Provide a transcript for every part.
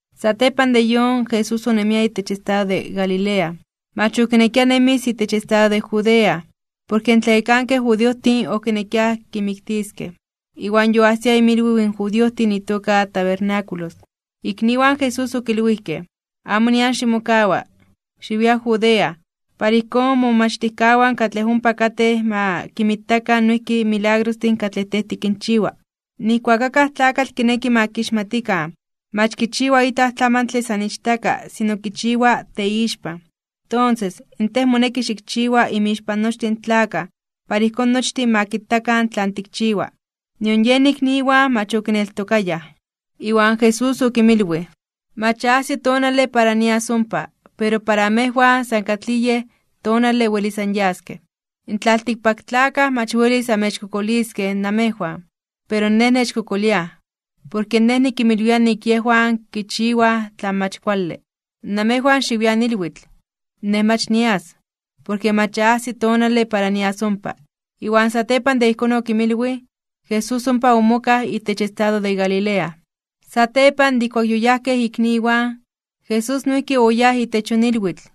Satepan de yon, Jesús onemia itech estado de Galilea. Mach okinekia nemis itech estado de Judea, porke in tlayekankej judiojtin okinekiaj kimiktiskej. Iwan yoajsia inmilwiw in judiojtin itoka tabernáculos. Ikniwan Jesús okilwijkej: ―Amo nian ximokawa. Xiwia Judea, para ijkón momomachtijkawan katlej ompa katej ma kinmitakan noijki in milagrostin katlej Tej tikinchiwa. Nijkuak akaj tlakatl kineki ma kixmatikan mach kichiwa itlaj tlamantle san ichtaka sino kichiwa teixpan. Tonses, in Tej moneki xikchiwa inmixpan nochtin in tlakaj para ijkón nochtin ma kitakan tlan tikchiwa. Nion yen ikniwan mach okineltokayaj. Iwan Jesús okinmilwij: ―Mach ya ajsi tonale para nias ompa, pero para amejwan san katlij yej tonale welis anyaskej. In tlaltikpaktlakaj mach welis amechkokoliskej namejwan. Pero Nej nechkokoliaj, porke Nej nikinmilwia nik yejwan kichiwaj tlan mach kuale. Namejwan xiwian ilwitl. Nej mach nias, porke mach ya ajsi tonale para nias ompa. Iwan satepan de ijkón okinmilwij, Jesús ompa omokaj itech estado de Galilea. Satepan de ijkuak yoyajkej ikniwan, Jesús noijki oyáj itech yon ilwitl,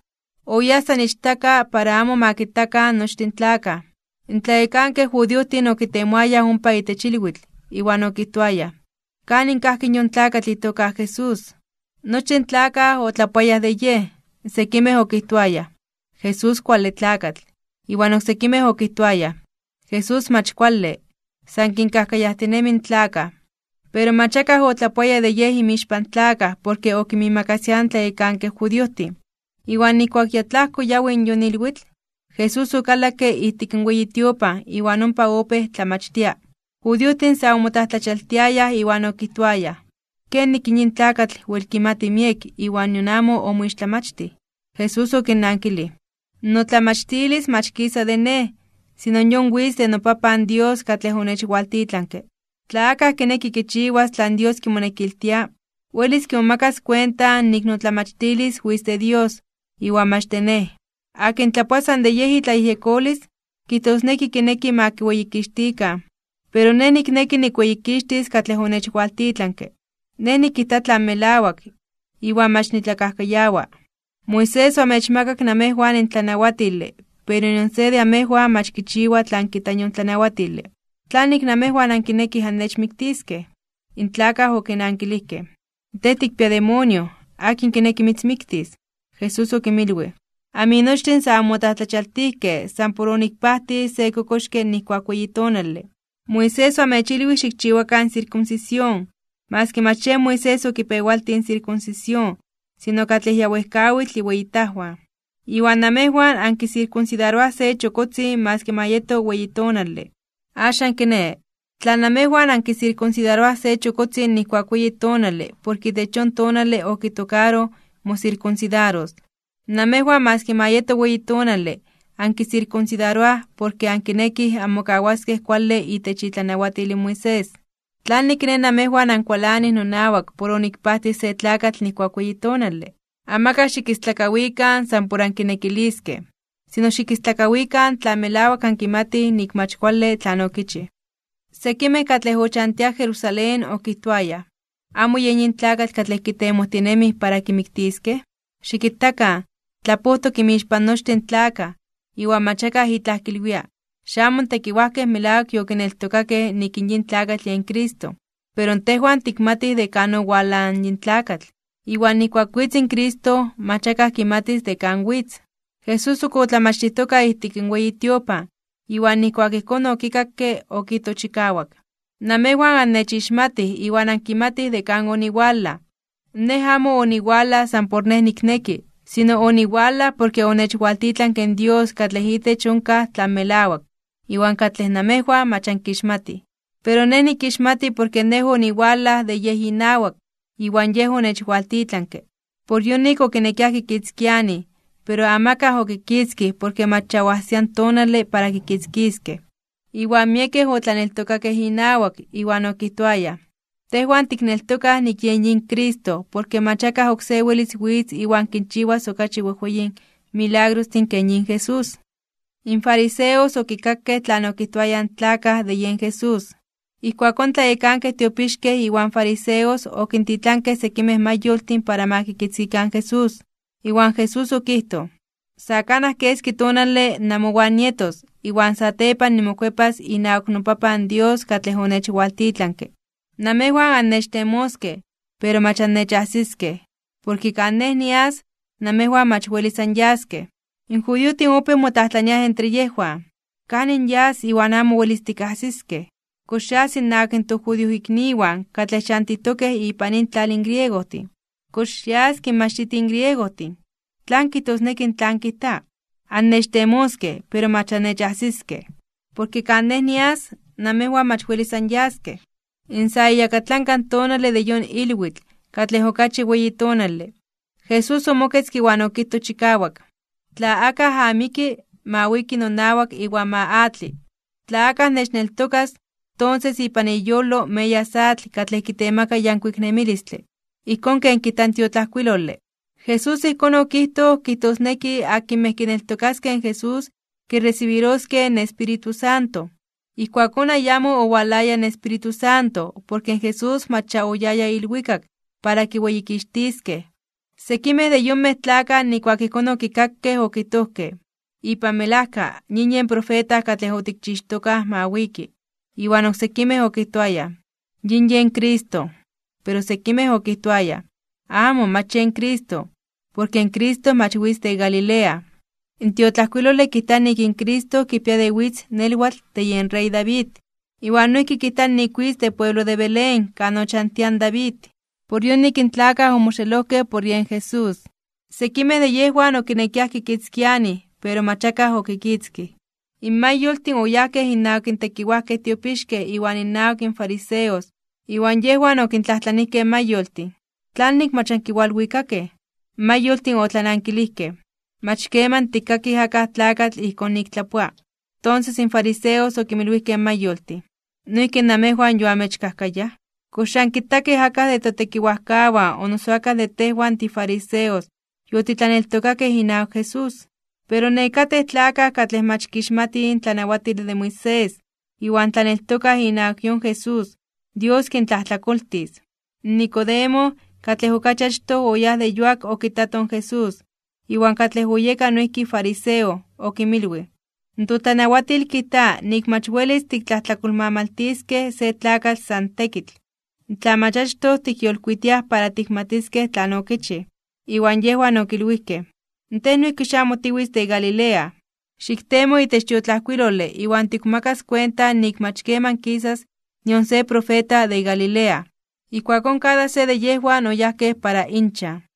oyáj san ichtaka para amo ma kitakan nochtin tlakaj. In tlayekankej judiojtin okitemoayaj ompa itech ilwitl, iwan okijtoayaj: ―¿Kanin kajki in yon tlakatl itoka Jesús? Nochtin tlakaj omotlapowiayaj de Yej. Sekimej okijtoayaj: “Jesús kuale tlakatl.” Iwan oksekimej okijtoayaj: “Jesús mach kuale, san kinkajkayajtinemi in tlakaj.” Pero mach akaj otlapoaya de Yej inmixpan tlakaj porke okinmiimakasiaj in tlayekankej judiojtin. Iwan nijkuak ya tlajko yawi in yon ilwitl, Jesús okalakke ijtik in weyi tiopan iwan ompa opéj tlamachtia. In judiojtin sa omotlajtlachialtiayaj (omomajmawtiayaj) iwan okijtoayaj: ―¿Kenik in yin tlakatl wel kimati miek iwan nion amo omoixtlamachtij? Jesús okinnankilij: ―Notlamachtilis mach kisa de Nej, sino yon witz de noPapan Dios katlej onechwaltitlanke. Tla akaj kineki kichiwas tlan Dios kimonekiltia, welis kimomakas kuenta nik notlamachtilis witz de Dios, iwan mach de Nej. Akin tlapoa san de yej itlayejyekolis, kijtosneki kineki ma kiweyikixtikan. Pero Nej nikneki nikweyikixtis katlej onechwaltitlanke. Nej nikijta tlan melawak, iwan mach nitlakajkayawa. ’Moisés oamechmakak namejwan in tlanawatile pero nion se de amejwan mach kichiwa tlan kijta yon tlanawatile. ¿Tlanik namejwan ankinekij annechmiktiskej? In tlakaj okinankilijkej: ―Tej tikpia demonio. ¿Akin kineki mitzmiktis? Jesús okinmilwij: ―Aminochtin sa anmotlajtlachialtijkej (omomajmawtijkej) san por onikpajtij se kokoxke nijkuak weyi tonale. Moisés oamechilwij xikchiwakan in sirkunsisión (maski mach yen Moisés okipewaltij in sirkunsisión sino katlej ya wejkawitl iweyitajwan). Iwan namejwan ankisirkunsidaroaj se chokotzin maski ma yeto weyi tonale. Axan kiné, tla namejwan ankisirkunsidaroaj se chokotzin nijkuak weyi tonale porke itech yon tonale okitokaroj mosirkunsidaros, namejwan maski ma yeto weyi tonale ankisirkunsidaroaj porke ankinekij anmokawaskej kuale itech itlanawatil in Moisés. ¿Tlanik kiné namejwan ankualanij nonawak por onikpajtij se tlakatl nijkuak weyi tonale? Amakaj xikistlakawikan san por ankinekiliskej. Sino xikistlakawikan tla melawak ankimatij nik mach kuale tlan okichij. Sekimej katlej ochantiaj Jerusalén okijtoayaj: ―¿Amo yen yin tlakatl katlej kitemojtinemij para kimiktiskej? Xikitakan, tlapojtok inmixpan nochtin in tlakaj, iwan mach akaj itlaj kilwia. ¿Xamo in tekiwajkej melawak yokineltokakej nik in yin tlakatl yen Cristo? Pero tejwan tikmatij de kan owalaj in yin tlakatl. Iwan nijkuak witz in Cristo, mach akaj kimatis de kan witz. Jesús ok otlamachtijtoka ijtik in weyi tiopan, iwan nijkuak ijkón okikakke, okijtoj chikawak: ―Namejwan annechixmatij iwan ankimatij de kan oniwalaj. Nej amo oniwalaj san por Nej nikneki, sino oniwalaj porke onechwaltitlanke in Dios katlej itech onkaj tlan melawak, iwan katlej namejwan mach ankixmatij. Pero Nej nikixmati porke Nej oniwalaj de Yej inawak, iwan Yej onechwaltitlanke. Por yonik okinekiaj kikitzkianij. Pero amakaj okikitzkij porke mach ya oajsia in tonale para kikitzkiskej. Iwan miekej otlaneltokakej inawak, iwan okijtoayaj: ―Tejwan tikneltokaj nik yen yin Cristo porke mach akaj oksé welis witz iwan kinchiwas okachi wejweyin milagrostin ken yin Jesús. In fariseos okikakej tlan okijtoayaj in tlakaj de yen Jesús. Ijkuakón in tlayekankej tiopixkej iwan in fariseos okintitlankej sekimej mayoltin para ma kikitzkikan in Jesús. Iwan Jesús okijtoj: ―Sa kanaj keski tonale namowan nietos, iwan satepan nimokuepas inawak noPapan Dios katlej onechwaltitlanke. Namejwan annechtemoskej, pero mach annechajsiskej. Porke kan Nej nias, namejwan mach welis anyaskej. In judiojtin opéj motlajtlaniaj entre yejwan: ―¿Kanin yas iwan amo welis tikajsiskej? ¿Kox yas innawak in tojudiojikniwan katlej chantitokej ipan intlal in griegojtin? ¿Kox yas kinmachtitij in griegojtin? ¿Tlan kijtosneki tlan kijta: “Annechtemoskej, pero mach annechajsiskej, porke kan Nej nias, namejwan mach welis anyaskej”? In sa iyakatlanka tonale de yon ilwitl, katlej okachi weyi tonale, Jesús omoketzke iwan okijtoj chikawak: ―Tla akaj amiki, ma wiki nonawak iwan ma atli. Tla akaj nechneltokas, tonses ipan iyolo meyas atl katlej kitemaka yankuik nemilistle, ijkón ken kijta in tiotlajkuilole. Jesús ijkón okijtoj kijtosneki akinmej kineltokaskej in Jesús kiresibiroskej in Espíritu Santo. Ijkuakón ayamo owalaya in Espíritu Santo porke in Jesús mach ya oyaya ilwikak para kiweyikixtiskej. Sekimej de yonmej tlakaj nijkuak ijkón okikakej okijtojkej: ―Ipan melajka yin yen profeta katlej otikchixtokaj ma wiki. Iwan oksekimej okijtoayaj: ―Yin yen Cristo. Pero sekimej okijtoayaj: ―Amo. Mach yen Cristo. Porke in Cristo mach witz de Galilea. In tiotlajkuilole kijta nik in Cristo kipia de witz nelwatl de yen rey David. Iwan noijki kijta nik witz de pueblo de Belén kan ochantia in David. Por yonik in tlakaj omoxelojkej por yen Jesús. Sekimej de yejwan okinekiaj kikitzkianij. Pero mach akaj okikitzkij. In mayoltin oyajkej innawak in tlayekankej tiopixkej iwan innawak in fariseos. Iwan yejwan okintlajtlanijkej in mayoltin: ―¿Tlanik mach ankiwalwikakej? In mayoltin otlanankilijkej: ―Mach keman tikkakij akaj tlakatl ijkón nik tlapoa. Tonses in fariseos okinmilwijkej in mayoltin: ―¿Noijki namejwan yoamechkajkayaj? ¿Kox ya ankitakej akaj de totekiwajkawan o noso akaj de tejwan tifariseos yotitlaneltokakej inawak Jesús? Pero nekatej tlakaj katlej mach kixmatij in tlanawatile de Moisés iwan tlaneltokaj inawak yon Jesús, Dios kintlajtlakoltis. Nicodemo, katlej okachi achtoj oyáj de yuak okitato in Jesús, iwan katlej oyeka noijki fariseo, okinmilwij: ―Totlanawatil kijta nik mach welis tiktlajtlakolmamaltiskej se tlakatl san tekitl, tla mach achtoj tikyolkuitiaj para tikmatiskej tlan okichij. Iwan yejwan okilwijkej: ―¿Tej noijki xamo tiwitz de Galilea? Xiktemo itech tiotlajkuilole iwan tikmomakas kuenta nik mach keman kisas nion se profeta de Galilea. Ijkuakón kada se de yejwan oyajkej para inchan.